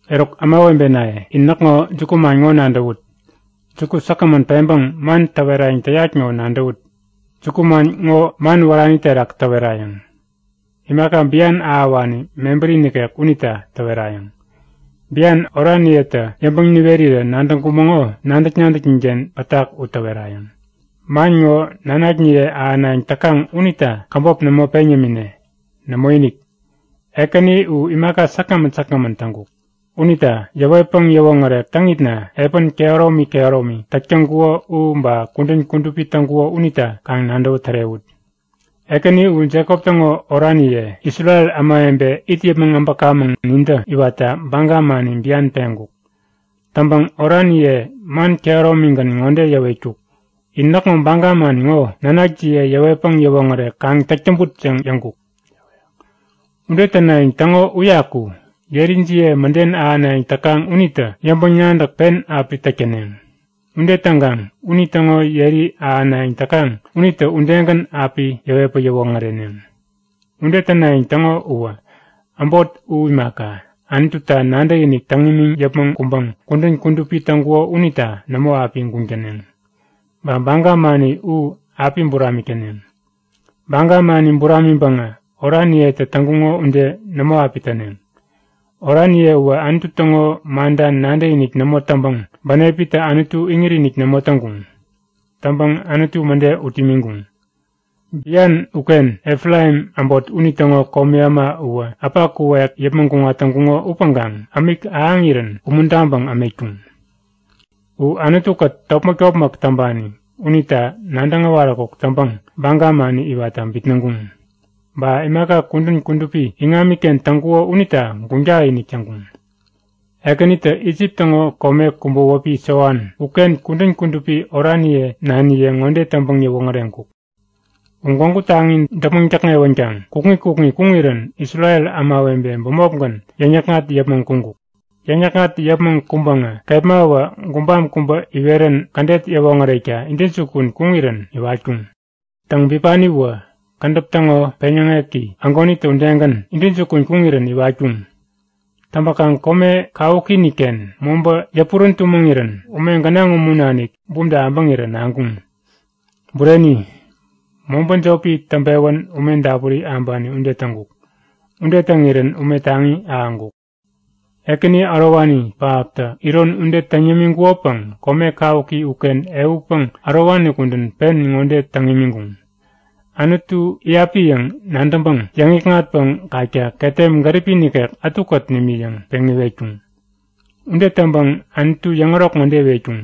Eruk ämawebenaye, in näkŋo jukuman ŋo nadäwut. Juku säkgämän peŋpäŋ man täwerayäŋ täyat ŋo nadäwut! Jukuman ŋo man wärani terak täwerayäŋ. Imaka bian ahäwani mebäri nikek unita täwerayäŋ. Bian oraniyetä yäŋpäŋ niwerirä nadäŋkumäŋo nadäk-nadäknin-ken pätak u tärewayäŋ. Man ŋo nanakniye ahänayäŋ täkaŋ unita käbop nämo peŋ yämine. Nämoinik! Ekäni u imaka säkgämän säkgämän täŋkuk. Unita yäwetpäŋ yäwoŋärek täŋitna epän kehäromi kehäromi täk täŋkuko u ba kudän kudupi täŋkuko unita kaŋ nadäwä tärewut. Ekäni u Jekop täŋo oraniye, Isrel ämawebe it yäpmäŋ äbäkamäŋ nintä iwatta baga mani bian peŋkuk. Täŋpäŋ oraniye man kehäromigän ŋode yäwetkuk; In näkŋo baga man ŋo nanakjiye yäwetpäŋ yäwoŋärek kaŋ täk täŋput yäŋ yäŋkuk. Ude tänayäŋ täŋo uyaku yerijiye mäden ahänayäŋ täkaŋ unitä yäŋpäŋ-nadäk pen api täk täneŋ. Ude täŋkaŋ unitäŋo yeri ahänayäŋ täkaŋ unitä udegän api yäwetpäŋ yäwoŋäreneŋ. Ude tänayäŋ täŋo uwä äbot u imaka, Anututa nadäkinik täŋ imiŋ yäpmäŋ kuŋpäŋ kudän kudupi täŋkuko unita nämo api guŋ täneŋ. Ba baga mani u api buramik täneŋ. Baga mani buramiŋpäŋä oraniyetä täŋkuŋo ude nämo api täneŋ. Oraniye uwä Anutu täŋo manta nadäkinik nämo täŋpäŋ bänepitä Anutu iŋit-inik nämo täŋkuŋ. Täŋpäŋ Anutu mäde ut imiŋkuŋ. Bian uken Efraim äbot unitäŋo komi äma uwä äpa kuwek yäpmäŋ kuŋat täŋkuŋo upäŋkaŋ ämik ahäŋirän umuntaŋpäŋ ämetkuŋ. U Anutukät topmäk-topmäk täŋpani unita nadäŋ äwaräkuk täŋpäŋ baga mani iwatta bitnäŋkuŋ. Ba imaka kudän kudupi iŋamiken täŋkuko unita guŋ tak-inik täŋkuŋ. Ekänitä Isip täŋo kome kubä wäpi Soan uken kudän kudupi oraniye naniye ŋode täŋpäŋ yäwoŋäreŋkuk; U gwägu taŋi däpmäŋ täkŋewänkaŋ kukŋi kukŋi kuŋirän Isrel ämawebe bämopgän yäŋ-yäkŋat yäpmäŋ kuŋkuk. Yäŋ-yäkŋat yäpmäŋ kuŋpäŋä kepmawä gubam kubä iwerän kädet yäwoŋärekta intäjukun kuŋirän iwatkuŋ. Täŋ bipaniwä kädäp täŋo peŋyäŋeki ägonitä udegän intäjukun kuŋirän iwatkuŋ. Täŋpäkaŋ kome kawukiinikken mobä yäpurän tumäŋirän ume gänaŋ umu nanik bumta abäŋirä naŋkuŋ. Bureni, mobä jopi täŋpewän ume dapuri abani ude täŋkuk. Ude täŋirän ume taŋi ahäŋkuk. Ekäni ärowani pähaptä iron ude täŋ yämiŋkukopäŋ kome kawuki uken ehutpäŋ ärowani kudän pen ŋode täŋ imiŋkuŋ; Anutu iyapi yäŋ nadäŋpäŋ yäŋikŋatpäŋ kakta ketem gäripi nikek ätukät nimi yäŋ peŋ iwetkuŋ. Ude täŋpäŋ Anutu yäŋärok ŋode iwetkuŋ;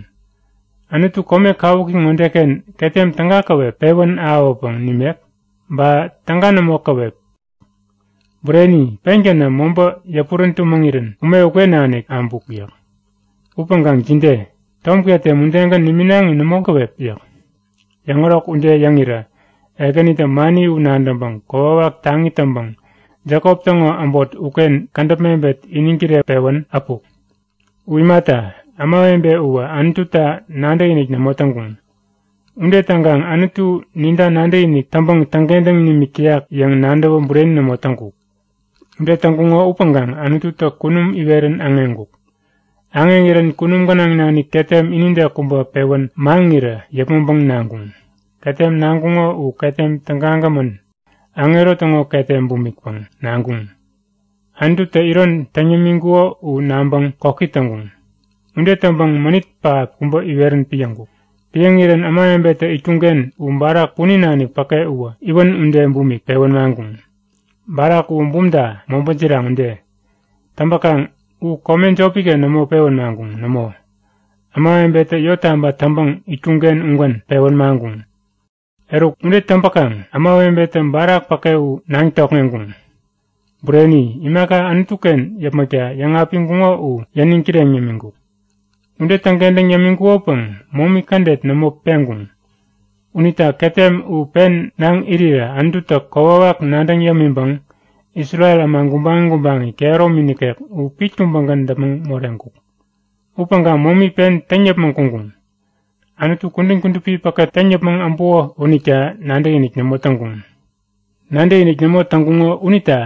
Anutu kome kawuki ŋodeken ketem täga käwep pewän ahäwäpäŋ nimek? Ba täga nämo käwep! yäk. Bureni, pengänä mobä yäpurän tumäŋirän ume uken nanik abuk yäk. Upäŋkaŋ jide? Tom ketem udegän niminaŋi nämo käwep? yäk. Yäŋärok ude yäŋirä Ekänitä mani u nadäŋpäŋ kokwawak taŋi täŋpäŋ Jekop täŋo äbot uken kädäp mebet iniŋ kireŋpewän äpuk. U imata, ämawebe uwä Anututa nadäkinik nämo täŋkuŋ. Ude täŋkaŋ Anutu ninta nadäkinik täŋpäŋ täŋkentäŋ nimik täyak yäŋ nadäwä bureni nämo täŋkuk. Ude täŋkuŋo upäŋkaŋ Anututä kunum iwerän aŋeŋkuk. Aŋeŋirän kunum gänaŋ nanik ketem inide kubä pewän maŋirä yäpmäŋpäŋ naŋkuŋ. Ketem naŋkuŋo u ketem tägagämän, aŋero täŋo ketem bumikpäŋ naŋkuŋ. Anututä iron täŋ yämiŋkuko u naŋpäŋ koki täŋkuŋ. Ude täŋpäŋ mänit pähap kubä iwerän piäŋkuk. Piäŋirän ämawebetä itkuŋken u barak punin nanik päke uwä iwän ude bumik pewän maŋkuŋ. Barak uwä bumta, mobä jiraŋ ude. Täŋpäkaŋ u kome jopiken nämo pewän maŋkuŋ. Nämo! Ämawebetä yottaba täŋpäŋ itkuŋken ugän pewän maŋkuŋ. Eruk, ude täŋpäkaŋ ämawebetä barak päke u naŋ tokŋeŋkuŋ. Bureni, imaka Anutuken yäpmäkta yäŋapiŋkuŋo u yäniŋ kireŋ yämiŋkuk. Ude täŋkentäŋ yämiŋkukopäŋ momi kädet nämo peŋkuŋ. Unita ketem u pen naŋ irirä Anututä kokwawak nadäŋ yämiŋpäŋ Isrel äma gubaŋi gubaŋi kehäromi nikek u pit kubägän däpmäŋ moreŋkuk. Upäŋkaŋ momi pen täŋ yäpmäŋ kuŋkuŋ. Anutu kudän kudupi päke täŋ yäpmäŋ äbuko unita nadäkinik nämo täŋkuŋ. Nadäkinik nämo täŋkuŋo unita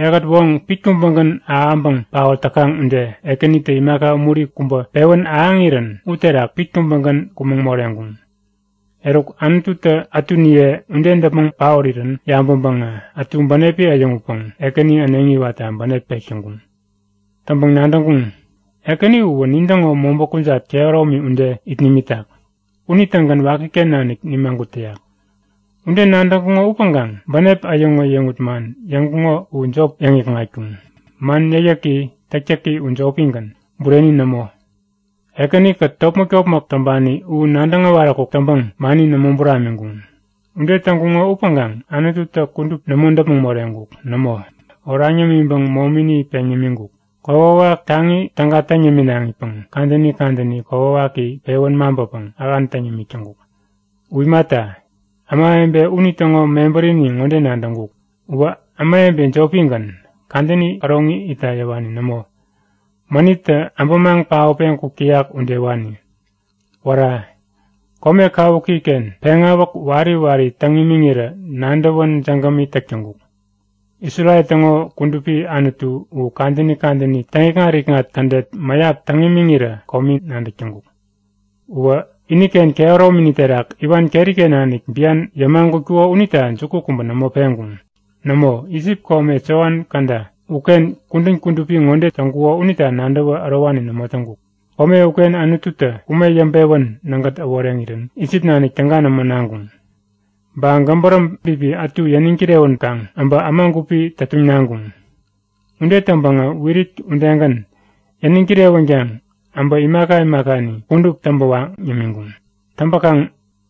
ehät woŋ pit kubägän abäŋpäŋ paot täkaŋ ude Ekänitä imaka umuri kubä pewän ahäŋirän uterak pit kubägän kumäŋ moreŋkuŋ. Eruk Anututä ätuniye ude däpmäŋ paorirän yabäŋpäŋä ätu bänepi äyäŋutpäŋ Ekäni äneŋi iwatta bänep pek täŋkuŋ. Täŋpäŋ nadäŋkuŋ; Ekäni uwä nintäŋo mobä kujat kehäromi ude it nimitak. Unitägän wakiken nanik nimagut täyak. Ude nadäŋkuŋo upäŋkaŋ bänep äyäŋut-äyäŋut man yäŋkuŋo u jop yäŋikŋatkuŋ. Man yäkyäki täktäki u jopigän, bureni nämo. Ekänikät topmäk-topmäk täŋpani u nadäŋ äwaräkuk täŋpäŋ mani nämo buramiŋkuŋ. Ude täŋkuŋo upäŋkaŋ Anututä kudup nämo däpmäŋ moreŋkuk. Nämo, oraŋ yämiŋpäŋ momini peŋ yämiŋkuk. Kokwawak taŋi täga täŋ yäminaŋipäŋ kadäni kadäni kokwawaki pewän maŋpäpäŋ ähan täŋ yämik täŋkuk. U imata, ämawebe unitäŋo mebärini ŋode nadäŋkuk; Uwä ämawebe jopigän, kadäni käroŋi itta yäwani nämo. Mänittä abämaŋ paotpeŋ kuk täyak udewani. Wära, kome kawukiken peŋawäk wari wari täŋ imiŋirä nadäwän jägämi täk täŋkuk! Isrel täŋo Kudupi Anutu u kadäni kadäni täŋikŋat-ikŋat kädet mäyap täŋ imiŋirä komi nadäk täŋkuk. Uwä iniken kehäromini terak iwan keriken nanik bian yämagutkuko unita juku kubä nämo peŋkuŋ. Nämo, Isip kome Soan käda uken kudän kudupi ŋode täŋkuko unita nadäwä ärowani nämo täŋkuk. Kome uken Anututä ume yäŋpewän nägät äworeŋirän Isip nanik täga nämo naŋkuŋ. Ba gäbäräm bipi ätu yäniŋ kirewänkaŋ abä äma gupi tätuŋ naŋkuŋ. Ude täŋpäŋä wirit udegän yäniŋ kirewänkaŋ äbä imaka imakani kudup täŋpä waŋ yämiŋkuŋ. Täŋpäkaŋ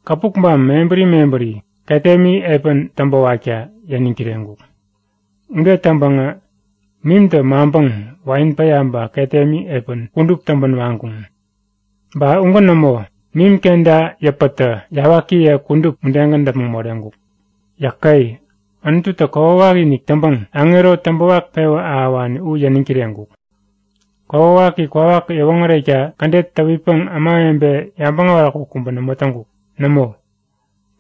kapukbam mebäri mebäri ketemi epäni täŋpäwakta yäniŋ kireŋkuk. Ude täŋpäŋä mimtä maŋpäŋ wain päya ba ketemi epän kudup täŋpän waŋkuŋ. Ba ugän nämo, mim kenta yäpätä yawakiye kudup udegän däpmäŋ moreŋkuk. Yäke! Anututä kokwawak wakiinik täŋpäŋ aŋero täŋpäwak pewä ahäwani u yäniŋ kireŋkuk. Kokwawaki kwawak yäwoŋärekta kädet täwitpäŋ ämawebe yabäŋ äwaräkuk kubä nämo täŋkuk. Nämo,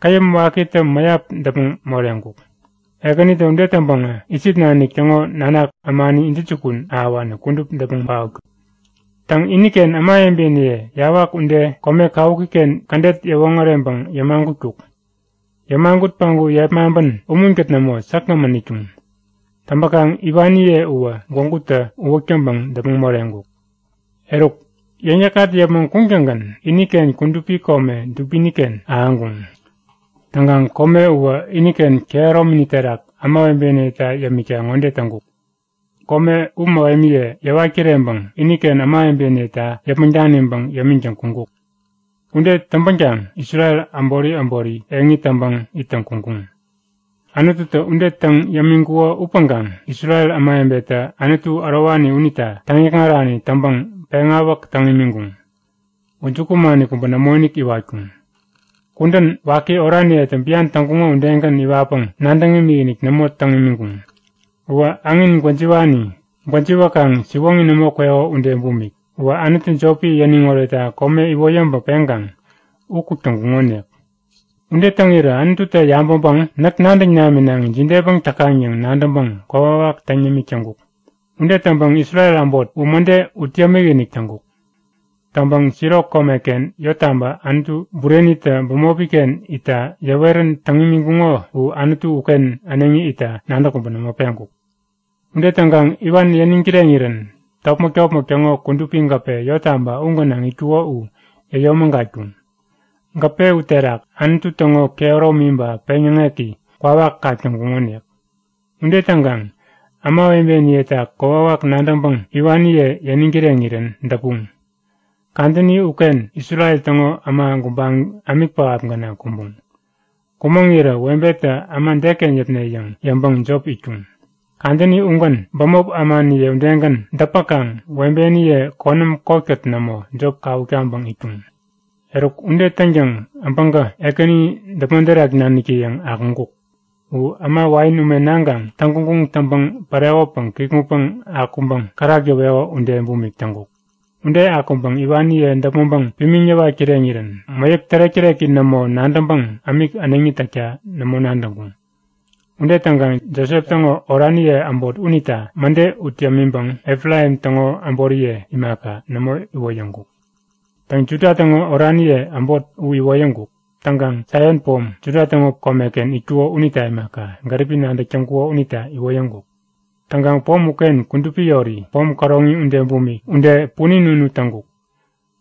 käyäm wakitä mäyap däpmäŋ moreŋkuk. Ekänitä ude täŋpäŋä Isip nanik täŋo nanak ämani intäjukun ahäwani kudup däpmäŋ paotkuk. Täŋ iniken ämawebeniye yawak ude kome kawukiken kädet yäwoŋäreŋpäŋ yämagutkuk. Yämagut päŋku yepmaŋpän umunkät nämo, säkgämän itkuŋ. Täŋpäkaŋ iwaniye uwä gwägutä uwäk täŋpäŋ däpmäŋ moreŋkuk. Eruk, yäŋ-yäkŋat yäpmäŋ kuŋtäŋgän iniken kudupi kome dubinken ahäŋkuŋ. Täŋkaŋ kome uwä iniken kehäromi terak ämawebeniyeta yämikta ŋode täŋkuk; Kome u mähemiye yäwat kireŋpäŋ iniken ämawebeniyeta yäpmäŋ daniŋpäŋ yämiŋtäŋ kuŋkuk. Ude täŋpänkaŋ Isrel äbori äbori eŋi täŋpäŋ ittäŋ kuŋkuŋ. Anututä ude täŋ yämiŋkuko upäŋkaŋ Isrel ämawebetä Anutu ärowani unita täŋikŋarani täŋpäŋ peŋawäk täŋ imiŋkuŋ. U jukumani kubä nämoinik iwatkuŋ. Kudän waki oraniyetä bian täŋkuŋo udegän iwatpäŋ nadäŋ imikinik nämo täŋ imiŋkuŋ. Uwä äŋin gwäjiwani gwäjiwäkaŋ siwoŋi nämo kweko ude bumik. Uwä anutu jopi yäniŋ oretta kome iwoyäŋpäŋ peŋkaŋ u kuk täŋkuŋonik. Ude täŋirä Anututä yabäŋpäŋ näk nadäŋ naminaŋi jidepäŋ täkaŋ yäŋ nadäŋpäŋ kokwawak täŋ yämik täŋkuk. Ude täŋpäŋ Isrel äbot u mäde ut yämik-inik täŋkuk. Täŋpäŋ Silo komeken yottaba Anutu burenitä bämopiken itta yäwerän täŋ imiŋkuŋo u Anutu uken äneŋi itta nadäk kubä nämo peŋkuk. Ude täŋkaŋ iwan yäniŋ kireŋirän topmäk-topmäk täŋo kudupi gäpe yottaba u gänaŋ itkuko u yäyomägatkuŋ. Gäpe u terak Anutu täŋo kehäromi ba peŋyäŋeki kwawak kak täŋkuŋonik. Ude täŋkaŋ ämawebeniyeta kokwawak nadäŋpäŋ iwaniye yäniŋ kireŋirän däpuŋ. Kadäni uken Isrel täŋo äma gubaŋi ämik pähap gänaŋ kumbuŋ. Kumäŋirä webetä äma deken yäpne yäŋ yäŋpäŋ jop itkuŋ. Kadäni ugän bämop ämaniye udegän däpäkaŋ webeniye konäm kotkät nämo, jop kawuk taŋpäŋ itkuŋ. Eruk ude täŋtäŋ äbäŋkä Ekäni däpmon terak naniktä-yäŋ akuŋkuk. U äma wain ume naŋkaŋ täŋguŋguŋ täŋpäŋ pärekopäŋ kikŋutpäŋ akuŋpäŋ kärak yäweko ude bumik täŋkuk. Ude akuŋpäŋ iwaniye däpmäŋpäŋ pimiŋ yäwat kireŋirän mäyäk tärek-täreki nämo nadäŋpäŋ ämik äneŋi täkta nämo nadäŋkuŋ. Ude täŋkaŋ Josep täŋo oraniye äbot unita mäde ut yämiŋpäŋ, Efraim täŋo äboriye imaka, nämo iwoyäŋkuk. Täŋ Juda täŋo oraniye äbot u iwoyäŋkuk. Täŋkaŋ Saion pom, Juda täŋo komeken itkuko unita imaka, gäripi nadäk täŋkuko unita iwoyäŋkuk. Täŋkaŋ pom uken kudupi yori, pom käroŋi ude punin unu täŋkuk.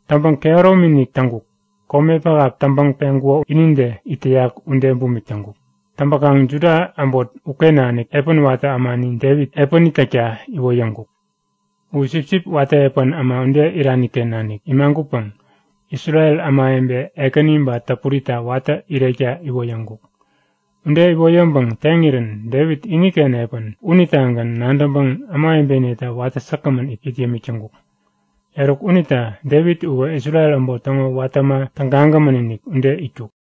Täŋpäŋ kehäromi-inik täŋkuk, kome pähap täŋpäŋ peŋkuko inide it täyak ude bumik täŋkuk. Täŋpäkaŋ Juda äbot uken nanik epän watä ämani Devit epäni täkta iwoyäŋkuk. U sipsip watä epän äma ude iraniken nanik imagutpäŋ Isrel ämawebe ekäni ba täpurita watä irekta iwoyäŋkuk. Ude iwoyäŋpäŋ teŋirän Devit iniken epän unitagän nadäŋpäŋ ämawebeniyeta watä säkgämän it yämik täŋkuk. Eruk unita Devit uwä Isrel äbot täŋo watä äma tägagämän-inik ude itkuk.